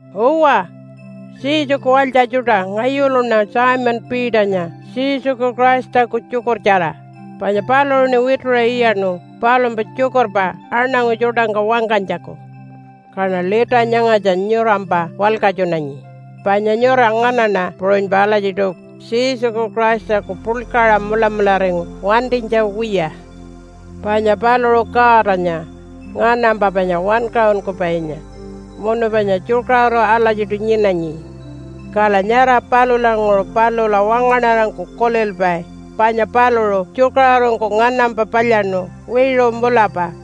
Uwa, Jesuku walytja tjuṯa, ngayuluṉa Simon Peternya Jesuku Christaku tjukurtjara, panya paluṟuṉi wituṟa iyaṉu palumpa tjukurpa aṉangu tjuṯangka wangkanytjaku. Kaṉa lita nyangatja nyurampa walkatjunanyi, panya nyura nganaṉa puṟunypa alatjiṯu Jesuku Christaku puḻkaṟa mulamularingu wantinytja wiya. Panya paluṟu Godanya, nganampa panya wankaṟunkupainya munu panya tjukaṟuru alatjiṯu nyinanyi. Kala nyara palulanguṟu palula wangaṉarangku kulilpai panya paluṟu tjukaṟurungku nganampa palyaṉu wiṟu mulapa.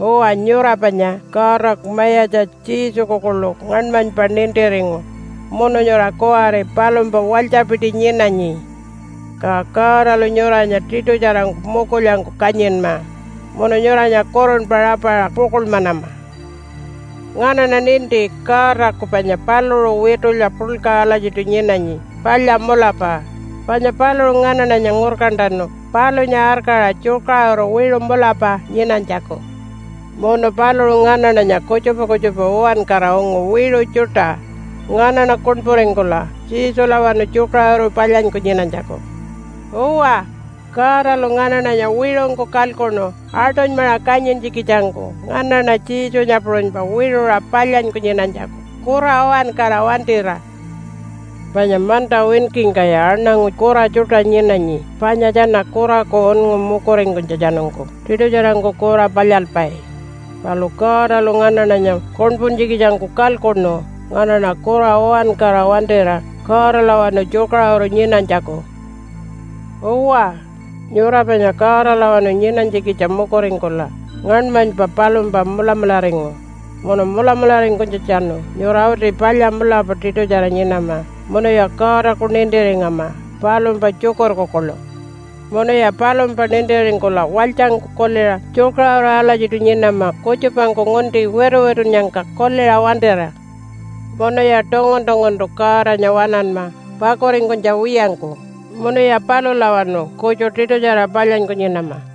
Uwa, nyura panya Godaku Mayatja Jesuku kuḻu ngaṉmanypa nintiringu munu nyura kuwari palumpa walytjapiti nyinanyi. Ka Godalu nyuranya tiṯutjarangku mukulyangku kanyinma munu nyuranya kurunpa rapaṟa pukuḻmanama. Nganaṉa ninti Godaku panya paluṟu witulya puḻka alatjiṯu nyinanyi palya mulapa. Panya paluṟu nganaṉanya ngurkantanu palunya arkaṟa tjukaṟuru wiṟu mulapa nyinanytjaku. Munu paluṟu nganaṉanya kutjupa kutjupa uwankara ungu wiṟu tjuṯa, nganaṉa kuṉpuringkula Jesulawanu tjukaṟuru palyanyku nyinanytjaku. Uwa, Godalu nganaṉanya wiṟungku kalkuṉu aṯunymaṟa kanyintjikitjangku nganaṉa Jesunya puṟunypa wiṟuṟa palyanyku nyinanytjaku kura uwankara wantira. Panya manta winkingkaya aṉangu kura tjuṯa nyinanyi panya tjana kuraku unngu mukuringkunytjatjanungku tiṯutjarangku kura palyalpai. Palu Godalu nganaṉanya kuṉpuntjikitjangku kalkuṉu nganaṉa kura uwankara wantira Godalawanu tjukaṟuru nyinanytjaku. Uwa, nyura panya Godalawanu nyinanytjikitja mukuringkula ngaṉmanypa palumpa mulamularingu. Munu mulamularingkunytjatjanu nyura uti palya mulapa tiṯutjara nyinama munuya Godaku nintiringama palumpa tjukurku kuḻu. Munuya palumpa nintiringkula walytjangku kuliṟa tjukaṟuru alatjiṯu nyinama kutjupangku ngunti wituwitunnyangka kuliṟa wantira. Munuya tungun-tunguntu Godanya waṉanma pakuringkunytja wiyangku, munuya palulawanu kutju tiṯutjara palyanyku nyinama.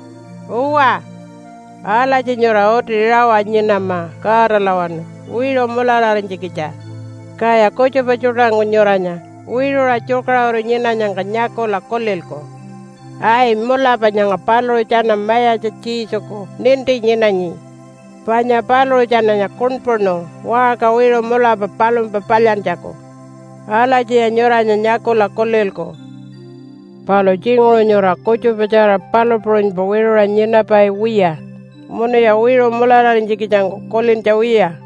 Uwa, alatji nyura uti rawa nyinama Godalawanu wiṟu mulararinytjikitja. Kaya kutjupa tjuṯangku nyuranya wiṟuṟa tjukaṟuru nyinanyangka nyakula kulilku, “Ai, mulapa nyanga paluṟu tjana Mayatja Jesuku ninti nyinanyi, panya paluṟu tjananya kuṉpuṉu waṟka wiṟu mulapa palumpa palyantjaku.” Alatjiya nyuranya nyakula kulilku. Palu tjinguṟu nyura kutjupatjara palu puṟunypa wiṟuṟa nyinapai wiya, munuya wiṟu mulararinytjikitjangku kulintja wiya.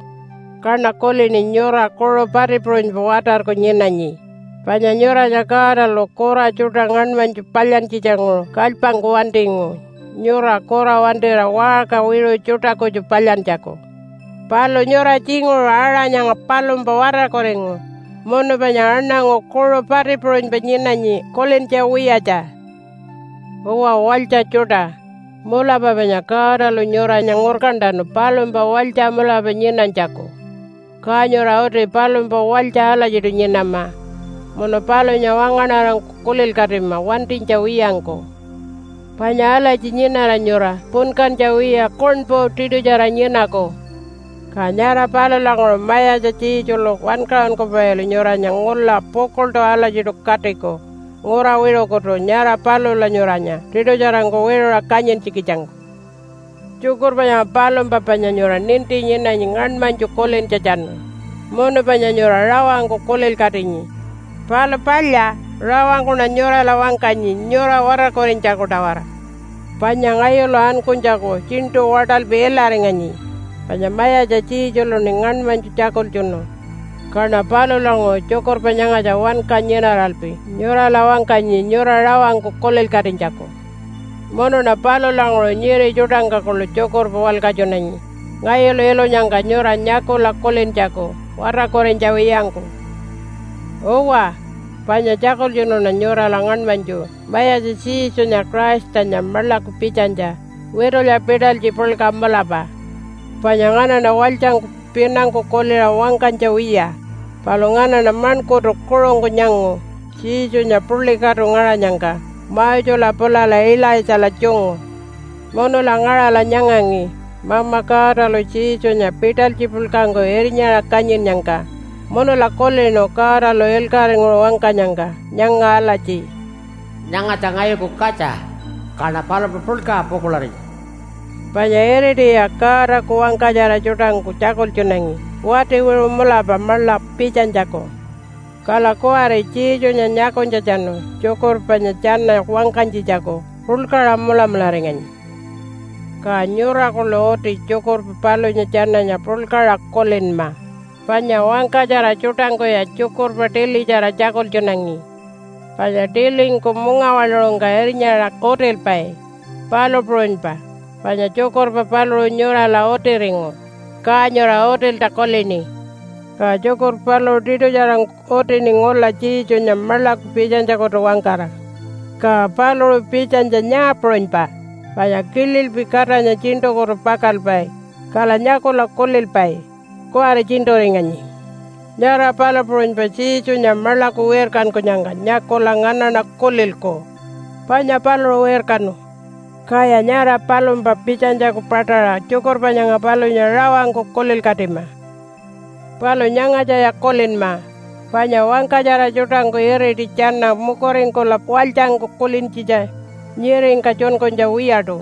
Kaṉa kulini nyura kuṟu pati puṟunypa watarku nyinanyi, panya nyuranya Godalu kura tjuṯa ngaṉmanytju palyantjitjanguṟu kalypangku wantingu nyura kura wantira waṟka wiṟu tjuṯa kutju palyantjaku. Palu nyura tjinguṟu aṟa nyanga palumpa watarkuringu munu panya aṉangu kuṟu pati puṟunypa nyinanyi kulintja wiyatja. Uwa walytja tjuṯa, mulapa panya Godalu nyuranya ngurkantanu palumpa walytja mulapa nyinanytjaku, ka nyura uti palumpa walytja alatjiṯu nyinama munu palunya wangaṉarangku kulilkatima wantinytja wiyangku. Panya alatji nyinara nyura punkantja wiya kuṉpu tiṯutjara nyinaku. Ka nyara palulanguṟu Mayatja Jesulu Wankaṟunkupailu nyuranya ngula pukuḻṯu alatjiṯu katiku ngura wiṟukutu nyara palula nyuranya tiṯutjarangku wiṟuṟa kanyintjikitjangku. Tjukurpa nyanga palumpa panya nyura ninti nyinanyi ngaṉmanytju kulintjatjanu, munu panya nyura rawangku kulilkatinyi. Palu palya, rawangkuṉa nyurala wangkanyi nyura watarkurinytjaku-tawara. Panya ngayulu ankunytjaku tjiṉṯu waṯalpi ilaringanyi, panya Mayatja Jesuluṉi ngaṉmanytju tjakultjunu. Kaṉa palulanguṟu tjukurpa nyangatja wanka nyinaralpi nyurala wangkanyi nyura rawangku kulilkatinytjaku. Munuṉa palulanguṟu nyiri tjuṯangka kuḻu tjukurpa walkatjunanyi ngayulu ilunyangka nyura nyakula kulintjaku watarkurinytja wiyangku. Uwa, panya tjakultjunuṉa nyurala ngaṉmanytju Mayatja Jesunya Christanya maḻaku pitjanytja witulya pitalytji puḻka mulapa. Panya nganaṉa walytjangku pinangku kuliṟa wangkanytja wiya, palu nganaṉa maṉkurtu kuṟungku nyangu Jesunya puḻi katu ngaṟanyangka Mosela pulala Ilaitjala tjungu. Munula ngaṟala nyangangi Mama Godalu Jesunya pitalytji puḻkangku irnyaṟa kanyinnyangka munula kulinu Godalu ilkaṟinguṟu wangkanyangka nyanga alatji, “Nyangatja ngayuku katja, kaṉa palumpa puḻkaṟa pukuḻarinyi.” Panya iritiya Godaku wangkatjara tjuṯangku tjakultjunangi wati wiṟu mulapa maḻa pitjanytjaku. Kala kuwari Jesunya nyakunytjatjanu tjukurpa panya tjana wangkanytjitjaku puḻkaṟa mulamularinganyi. Ka nyura kuḻu uti tjukurpa palunya tjananya puḻkaṟa kulinma, panya wangkatjara tjuṯangkuya tjukurpa tilitjara tjakultjunangi. Panya tilingku mungawaḻuṟungka irnyaṟa utilpai, palu puṟunypa panya tjukurpa paluṟu nyurala utiringu, ka nyura utilta kulini. Ka tjukurpa paluṟu tiṯutjarangku utini ngula Jesunya maḻaku pitjanytjakutu-wangkara. Ka paluṟu pitjanytja nyaa puṟunypa, panya kililpi Katanya tjiṉṯukutu pakalpai kala nyakula kulilpai, “Kuwari tjiṉṯuringanyi.” Nyara palu puṟunypa Jesunya maḻaku wirkankunyangka nyakula nganaṉa kulilku, “Panya paluṟu wirkanu.” Kaya nyara palumpa pitjanytjaku paṯaṟa tjukurpa nyanga palunya rawangku kulilkatima. Palu nyangatjaya kulinma, panya wangkatjara tjuṯangku iriti tjana mukuringkula walytjangku kulintjitja nyiringka tjunkunytja wiyaṯu.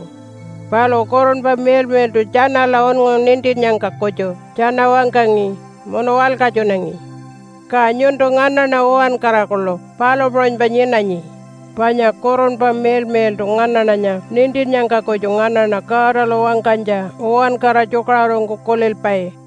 Palu Kurunpa Miḻmiḻṯu tjanala unngu nintinnyangka kutju tjana wangkangi munu walkatjunangi. Ka nyuntu nganaṉa uwankara kuḻu palu puṟunypa nyinanyi, panya Kurunpa Miḻmiḻṯu nganaṉanya nintinnyangka kutju nganaṉa Godalu wangkanytja uwankara tjukaṟurungku kulilpai.